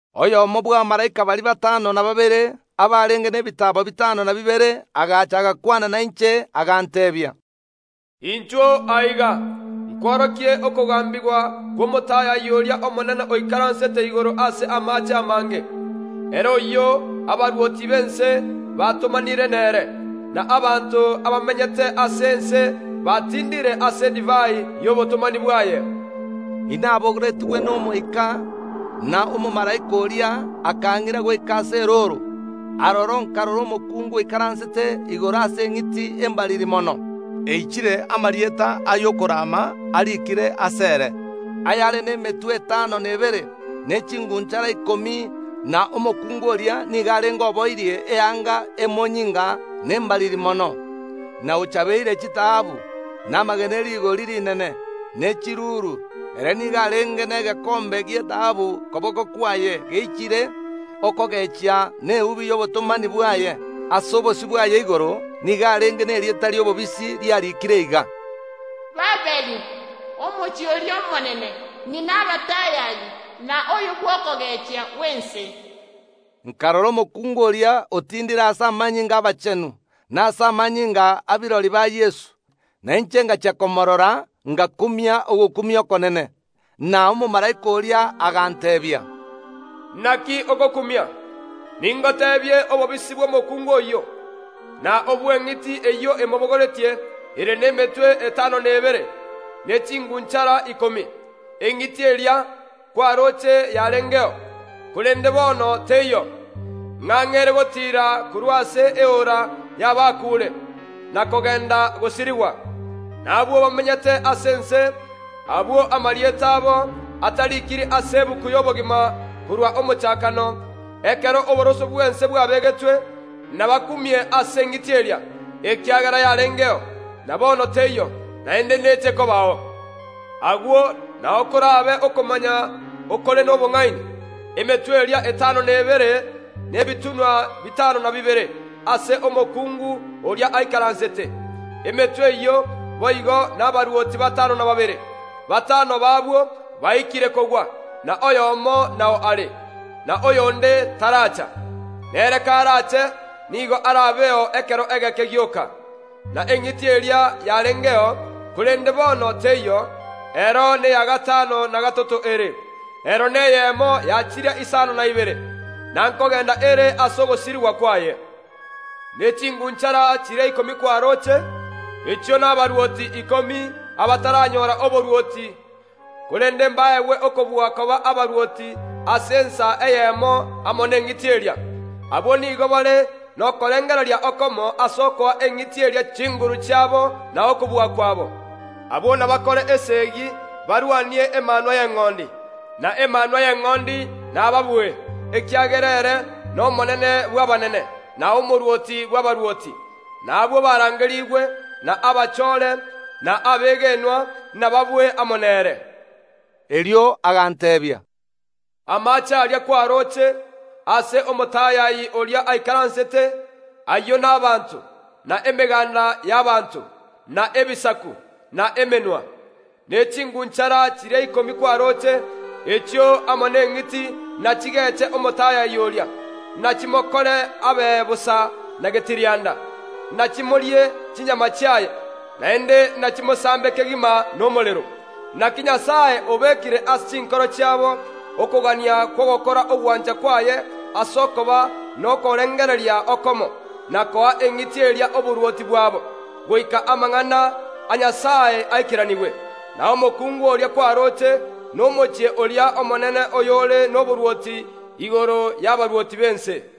Oyomo bw’abamalaika baria batano na babere, abarenge nebitaabo bitano na bibere, agacha, agakwana nainche, aganteebia, “Inchuo aiga, nkworokie okogambigwa kw’omotayayi oria omonene oikaransete igoro ase amaache amange. Ere oyio abarwoti b’ense batomanire nere, na abanto abamenyete ase ense batindire ase edivai y’obotomani bwaye.” Inabogoretigwe n’Omoika, na omomalaika oria akang’ira goika ase erooro. Aroro nkarora omokungu oikaransete igoro ase eng’iti embariri mono, eichire amarieta ay’okorama ariikire asere, eyare nemetwe etano na ebere, ne ching’unchara ikomi. Na omokungu oria nigo arenge oboirie eanga emonyinga na embariri mono, na ochabeire chitaabu, na amagena e rigori rinene, ne chiruru. Ere nigo arenge negekombe gi’etaabu koboko kwaye, geichire okogechia na eubi y’obotomani bwaye. Ase obosio bwaye igoro nigo arenge nerieta ri’obobisi riarikire iga: “Babiloni, omochie oria omonene, ng’ina abatayayi na oyo bw’okogechia gw’ense.” Nkarora omokungu oria, otindire ase amanyinga ’abachenu, na ase amanyinga a birori ba Yeso. Na inche ngachia komoorora ngakumia ogokumia okonene. Na omomalaika oria aganteebia, “Naki ogokumia? Ningoteebie obobisi bw’omokuungu oyio, na obw’eng’iti eyio emobogoretie ere nemetwe etano na ebere, ne ching’unchara ikomi. Eng’iti eria kwarooche yarengeo, korende bono teiyo, ng’ang’e ere gotiira korwa ase eora y’abakuure na kogenda gosirigwa. Na abwo bamenyete ase ense, abwo amarieta abo atarikiri ase egetabu y’obogima korwa omochakano, ekero oboroso bw’ense bwabegetwe, nabakumie ase eng’iti eria, ekiagera yarengeo, na bono teiyo, naende neche kobao. Agwo nao korabe okomanya okore nobong’aini. Emetwe eria etano na ebere nebitunwa bitano na bibere, aase omokungu oria aikaransete. Emetwe eyio boigo nabarwoti batano na babere. Batano b’abwo baikire kogwa, na oyomo nao are, na oyonde taracha. Nere karache nigo arabeo ekero egeke gioka. Na eng’iti eria yarengeo, korende bono teiyo, ero neya gatano na gatato ere, Ero neyemo ya chiria isano na ibere, na nkogenda ere ase ogosirigwa kwaye. Ne ching’unchara chiria ikomi kwaroche, echio nabarwoti ikomi abataranyora oborwoti, korende mbaegwe okobua koba abarwoti ase ensa eyemo amo neng’iti eria. Abwo nigo bare nokorengereria okomo ase okoa eng’iti eria chinguru chiabo na okobua kwabo. Abwo nabakore esegi barwanie Emanwa y’Eng’ondi, na Emanwa y’Eng’ondi nababue, ekiagera ere n’Omonene bw’abanene, na Omorwoti bw’abarwoti; na abwo barangerigwe, na abachoore, na abegenwa nababue amo nere.” Erio aganteebia, Amache aria kwaroche, aase omotayayi oria aikaransete, ayio nabaanto, na emegaanda y’abanto, na ebisaku, na emenwa. Ne ching’unchara chiria ikomi kwaroche, echio amo neng’iti nachigeche omotayayi oria; nachimokore abe bosa na getirianda, nachimorie chinyama chiaye, naende nachimosambe kegima nomorero. Naki Nyasae obekire ase chinkoro chiabo okogania kw’ogokora ogwancha kwaye ase okoba nokorengereria okomo, na koa eng’iti eria oborwoti bwabo, goika amang’ana a Nyasae aikeranigwe. Na omokungu oria kwaroche nomochie oria omonene oyore noborwoti igoro y’abarwoti b’ense.